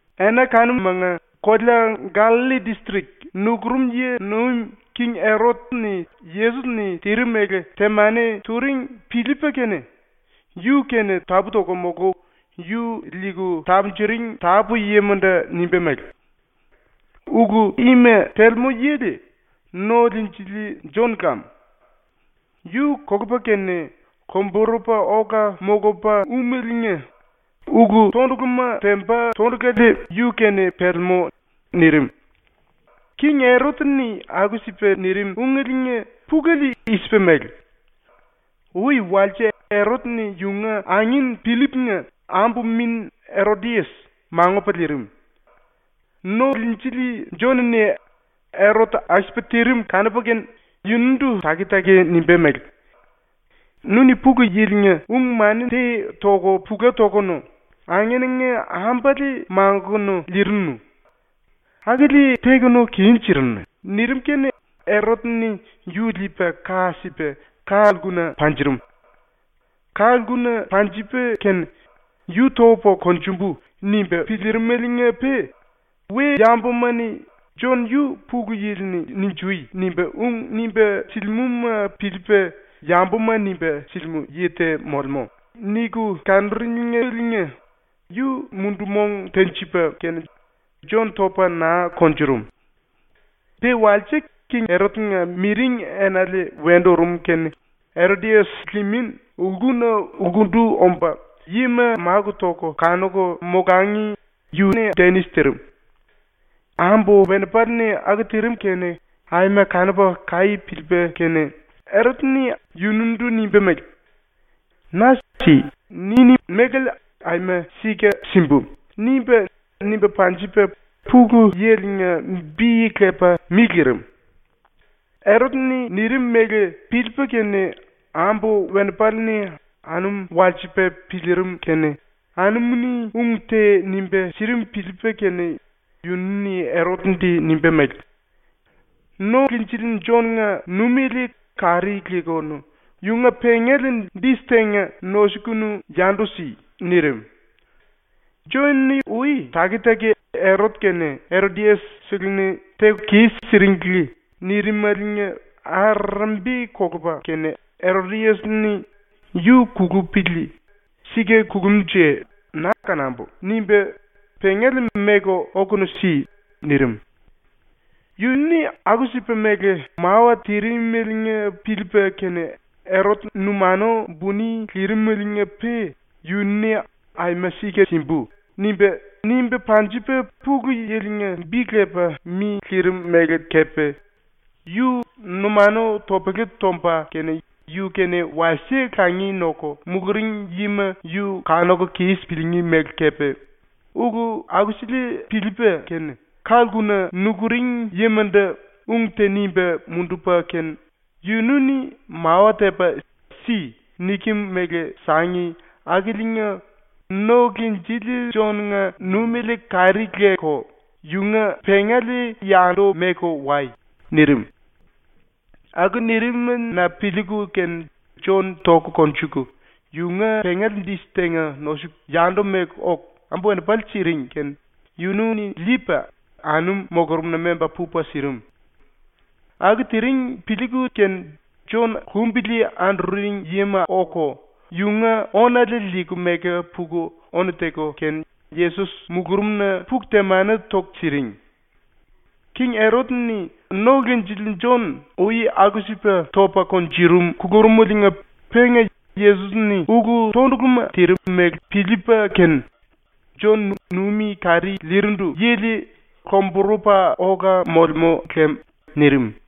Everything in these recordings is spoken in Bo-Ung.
Ena kanumanga kolea Gallalli distrik nukurum yi nuim king Erot-ni Yesos-ni tirim mele temani turing piliipa kene yu-kene tapú-toku molku yu liiku tapunjuring tapú-yimandu nimba mele: “Ulu ima telemú yili No-Liinjili Jon lam! Yu kolupa kene lomburupa ola molupa úmeliinga ulu-tonduluma temba tondulale yu-kene pelemú.” nirim. ⸤King Erot-ni aku-sipa nirim ungeliinga pulele i-sipa mele:⸥ Ui walse Erot-ni yunga angin Pillip-nga ambu-min Erodias mangupa liirim. ⸤No-Liinjili⸥ Jon-ni Erot aku-sipa tirim kanupa kene yunundu taki-taki nimba mele: “Nu-ni ⸤Pulu Yili-nga⸥ ung-mani te toku pula tokunu angenanga ambale mangukunu liirinu. Akili tekunu kis-sirinu.” nirim kene Erot-ni yu liipa ka sipa ka-lkuna panjurum. Ka-lkuna panjipa kene ‘Yu topu konjumbu.’ nimba piliirimeliinga-pe we-yambuma-ni ‘Jon yu Pulu Yili-ni “Ninjui!” nimba ung nimba silimúma piliipa yambuma nimba silimú yi te molemú.’ niku kanuringeliinga yu mundu-mong tenjipa kene Jon topa naa kunjurum. Pe walse king Erot-nga miring enale wendu urum kene Erodias limin lkuna lkundu omba, yima máku toku kanuku molangi yu denis tirim. Erot-ni ambu-wenipale-ni aku tirim kene aima kanupa kaí piliipa kene yunundu nimba mele: “Na “Si.” niní mélale aima sika simbu.” nimba, nimba panjipa Pulu Yili-nga bi lepa mi lirim. Erot-ni nirim mele piliipa kene ⸤ambu-wenipale-ni anum walsipa piliirim kene⸥ anumu-ni ung te nimba sirim piliipa kene yunu-ni Erot-ndu nimba mele: “No-Liinjili Jon-nga ⸤numiele kari lekunu yunga⸥ pengale dis tenga nosukunu yandu si.” nirim. ⸤Jon-ni ui taki-taki “Erot kene Erodias-seleni teku kis-siringli.” nirimaliinga arerembi kolupa kene Erodias-ni ‘Yu kulupili. Sika kulumnje na kanambu.’ nimba “Pengale meku okunu si.” nirim.⸥ Yu-ni aku-sipa mele mawa tirimeliinga piliipa kene Erot numanu buni lirimeliinga-pe yunu-ni “Aima sika simbu.” nimba, nimba panjipa Pulu Yili-nga bi lepa mi lirim mele kepe, yu numanu topele tomba kene yu-kene wasie langi noku muluring yima yu kanuku kis piliingí mele kepe, ulu akusele piliipa kene, ka-lkuna nukuring yimandu ung te nimba mundupa kene “Yunu-ni mawa tepa “Si.” nikem mele sangi akiliinga ⸤No-Liinjili⸥ Jon-nga ⸤numiele kari leku yunga⸥ pengale yandu meku wai.” nirim. Aku nirim-na piliiku kene Jon toku konjuku, yunga pengale dis tenga nosuku, yandu meku oku ambu-wenipale siring kene yunu-ni liipa anum mulurumna memba pupa sirim. Aku tiring piliiku kene Jon lumbili anduring yima oku yunga ónale liiku meku puku ónu teku kene Yesos mulurumna puku temani toku siring. ⸤King Erot-ni No-Liinjili Jon ui aku-sipa topa kunjurum kulurumeliinga penga Yesos-ni ulu-tonduluma tirim mele piliipa kene “Jon numi kari lirindu yili lomburupa ola molemú lem.” nirim.⸥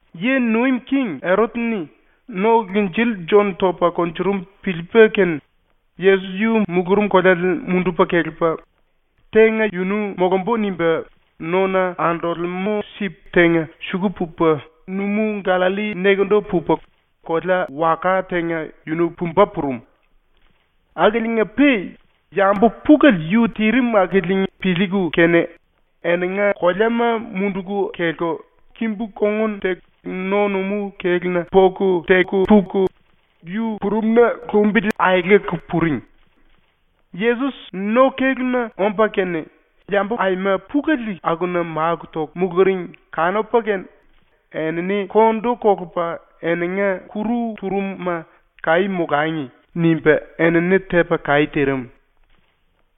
⸤Yi nuim king⸥ Erot-ni No-Liinjili Jon topa kunjurum piliipa kene, Yesos yu mulurum koleale mundupa kelepa ‘Tenga yunu molumbu.’ nimba nona andolemú sip tenga suku pupa numú-⸤Gallalli⸥ nekendu pupa kolea-waka tenga yunu pumba purum. Akiliinga-pe yambu pulele yu tirim akili piliiku kene eninga koleama munduku kelku kimbu-kongun teku no-numú kéluna poku teku puku yu purumna lumbili aeleku puring. Yesos no-kéluna omba kene yambu aima pulele akuna máku toku muluring kanupa kene enini kondu kolupa eninga kuru turum-ma ‘Kaí molangi.’ nimba enini tepa kaí tirim.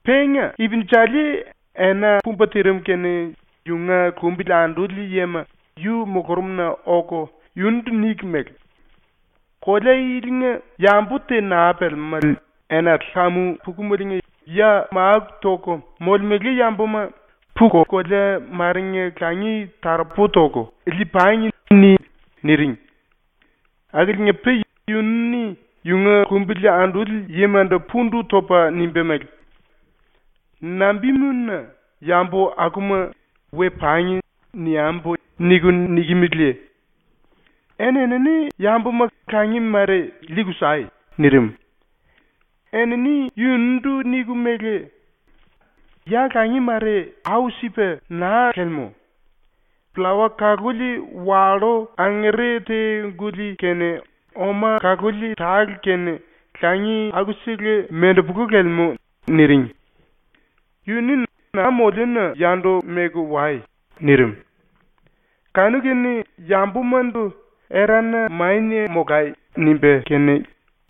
Penga ipinjali ena pumba tirim kene yunga lumbili anduli yima yu mulurumna oku yunundu niku mele: “Kolea ilinga yambu te naa pelemelé, enale kamu pukumeliinga ya máku toku molemele yambuma ‘Puku kolea marenga langi taropu toku lii-pangi.’ ni.” niring. Akiliinga-pe yunu-ni yunga lumbili anduli yimandu pundu topa nimba mele: “Nambimuna ‘yambu akuma ‘We pangi.’ niambu.’ niku nikimeleye? Eni-enini yambuma langi mare liiku sai.” nirim. Enini yunundu niku mele: “Ya langi mare au-sipa naa lelemú. Pllawa kaluli wallú angere te-guli kene oma kaluli tale kene langi aku-sele mendepolu lelemú.” niring. Yu-ni “Na moliuna yandu meku wai.” nirim. Kanu-kene yambumandu “Erana mania molai.” nimba kene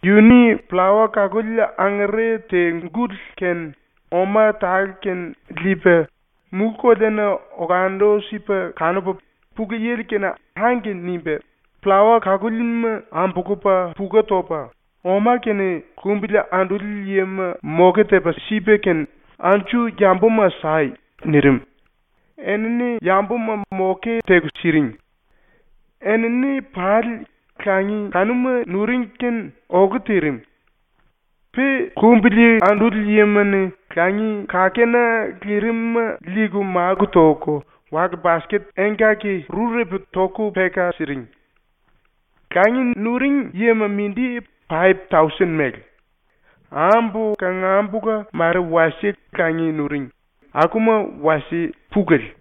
yu-ni pllawa kaluli angere te-guli kene oma tale kene liipa mulú-koleana olandu-sipa kanupa ⸤Pulu Yili-kene⸥ “Angke” nimba pllawa kalúlima ambulupa puku topa ⸤oma kene⸥ lumbili anduli yima moke tepa sipa kene “Anju yambuma sai.” nirim, enini yambuma moke teku siring. Enini pali langi kanuma nuring kene olu tirim. Pe lumbili anduli yima-ni langi kakena lirim-ma liiku máku toku wale-basket engkaki-rurepu toku peka siring. Langi nuring yima mindi paip-tausen mele. Ambu kangambula ⸤mare wasie langi nuring⸥ akuma wasie pulele.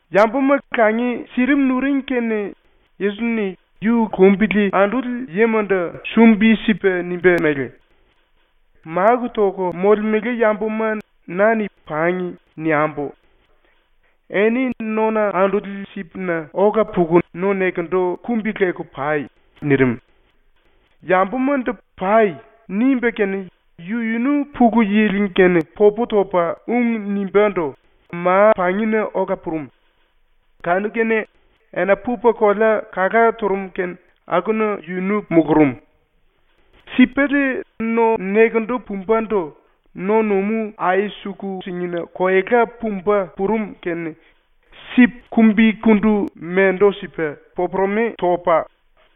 ⸤Yambuma langi sirim nuring⸥ kene Yesos-ni yu lumbili anduli yimandu sumbi-sipa nimba mele: “Máku toku molemele yambuma na-ni “Pangi.” niambu. Eni nona anduli sipna ola puku no-nekendu kumbi-leku pai.” nirim. Yambumandu “Pai.” nimba kene yu-yunu Pulu Yili-kene popu topa ung nimbándu ma-pangina ola purum. Kanu-kene ena pupa kolea kala turum kene akuna yunu mulurum. Sipele no-nekendu pumbandu no-numú ai-suku-singina koela pumba purum kene sip kumbikundu mendu-sipa popuremi topa,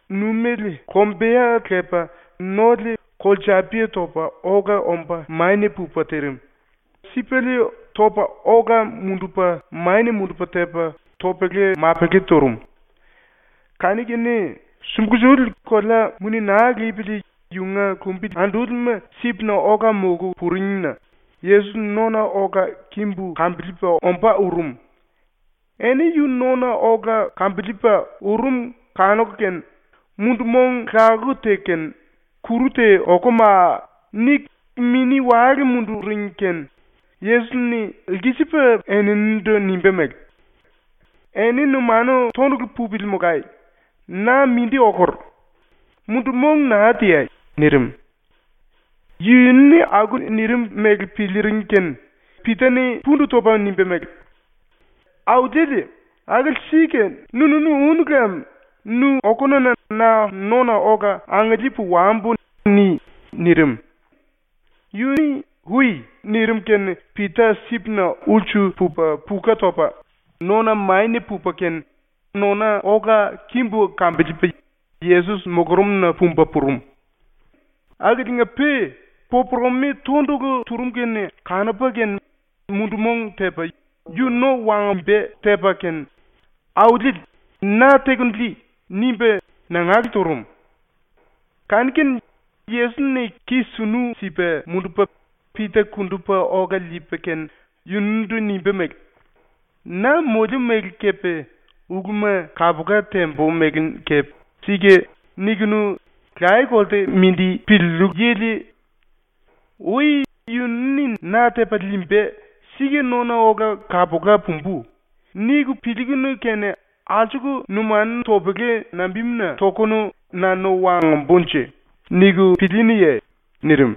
numéle lombeya lepa nole kolsapia topa ola omba mania pupa tirim, sipele topa ola-mundupa mania-mundupa tepa topele-mapele turum. Kanu-kene sumbulsuli kolea muni naa lipili ⸤yunga lumbili andúlima sipna ola molku⸥ puringna Yesos nona ola kimbu kambiliipa ombá urum. Eni yu nona ola kimbu kambiliipa urum kanuku kene, mundu-mong lakuku teku kene “Kuru te okumaa!” niku mini-wale munduring kene Yesos-ni lkisipa eninindu nimba mele: “Eni numanu tondulu pupili molai. Na mindi okur. Mundu-mong naa teai.” nirim. ⸤Yunu-ni aku nirim mele piliiring kene⸥ Pita-ni pundu topa nimba mele: “Auliele, akili sika nu-nunu únu lem nu okununa na nona ola angiliipu wambu ni.” nirim. Yu-ni “Ui.” nirim kene Pita sipna ulsu pupa puka topa nona mania pupa kene nona ola kimbu kambiliipa Yesos mulurumna pumba purum. Akiliinga-pe popuremi tondulu turum kene kanupa kene mundu-mong tepa yu no wangomba tepa kene, “Auliele, na tekunu lii!” nimba nangale turum. Kanu-kene Yesos-ni ki sunu sipa mundupa Pita kundupa ola liipa kene yunundu nimba mele: “Na moliu mele kepe uluma kapula tembu mele kepe “Sika” nikunu laye-kolte mindi piliillu lem. Ui ‘Yunu-ni na tepa liimba, sika nona ola kapula pumbu.’ niku piliikunu kene alsuku numanu topele nambimuna tokunu ‘Na no wangombunje?’ niku pilíínuye?” nirim.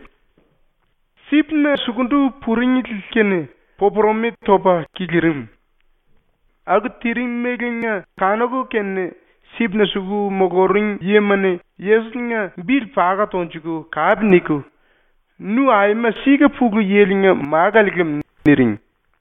Sipna sukundu puringli kene popuremi topa kilirim. Aku tirimeliinga kanuku kene sipna suku muluring yima-ni Yesos-nga bili paka tonjuku kape niku “Nu aima sika Pulu Yili-nga Málale lam.” niring.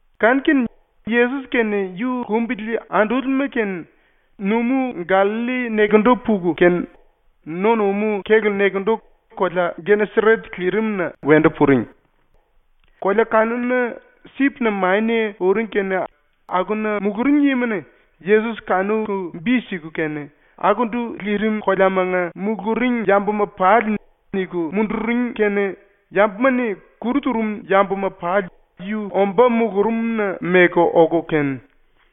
Kanu-kene ⸤Yesos kene yu lumbili andúlima kene⸥ numú ⸤Gallalli⸥ nekendu puku kene no-numú kélu nekendu kolea Geneseret lirimna wendu puring. ⸤Kolea kanuna sipna mania uring kene⸥ akuna muluring yima-ni Yesos kanuku bi siku kene akundu lirim koleamanga muluring yambuma pali niku munduring kene yambuma-ni kuru turum yambuma pali yu omba mulurumna meku oku kene,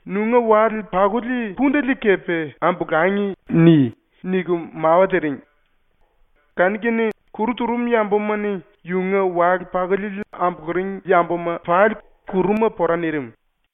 “‘Nunga wale-pakuli pundele kepe ambolangi.’ ni.” niku mawa tiring. Kanu-kene kuru turum yambuma-ni yunga wale-pakuliele ambuluring yambuma pali kuruma pora nirim.